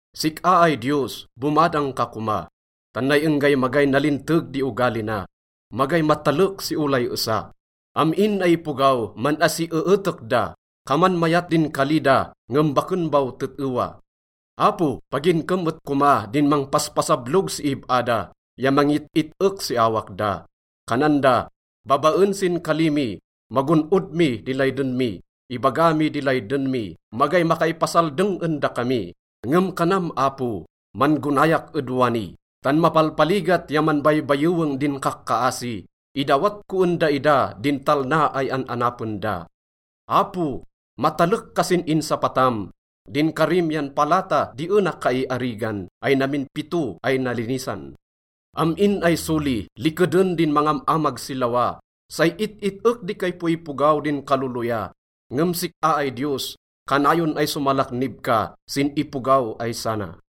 Sik-a ay Diyos, bomadang ka koma, tan nay enggay magay nalinteg di ogali na, magay matalek si olay esa. Am-in ay ipogaw, man-asieetek da. Kaman mayat din kali da ngem baken baw tet-ewa. Apo, paginkem et koma din mangpaspasablog si ib-a da ya mangit-it-ek si awak da. Kanan da, “Babaen sin kali mi, magon-od mi di layden mi. Ibaga mi di layden mi, magay makaipasaldeng en dakami.” Ngem kanam, Apo, “Man-gonayak ed wani, tan mapalpaligat ya manbaybayeweng din kakkaasi. Idawat ko en daida din talna ay an-anapen da.” Apo, matalek ka sin insapatam. Din karim yan palata di ena kaiarigan, ay namin pito ay nalinisan. Am-in ay soli, likeden din mangam-amag si lawa, say it-it-ek di kaipoipogaw din kaloloya. Ngem sik-a ay Diyos, kanayon ay somalaknib ka sin ipogaw ay sana.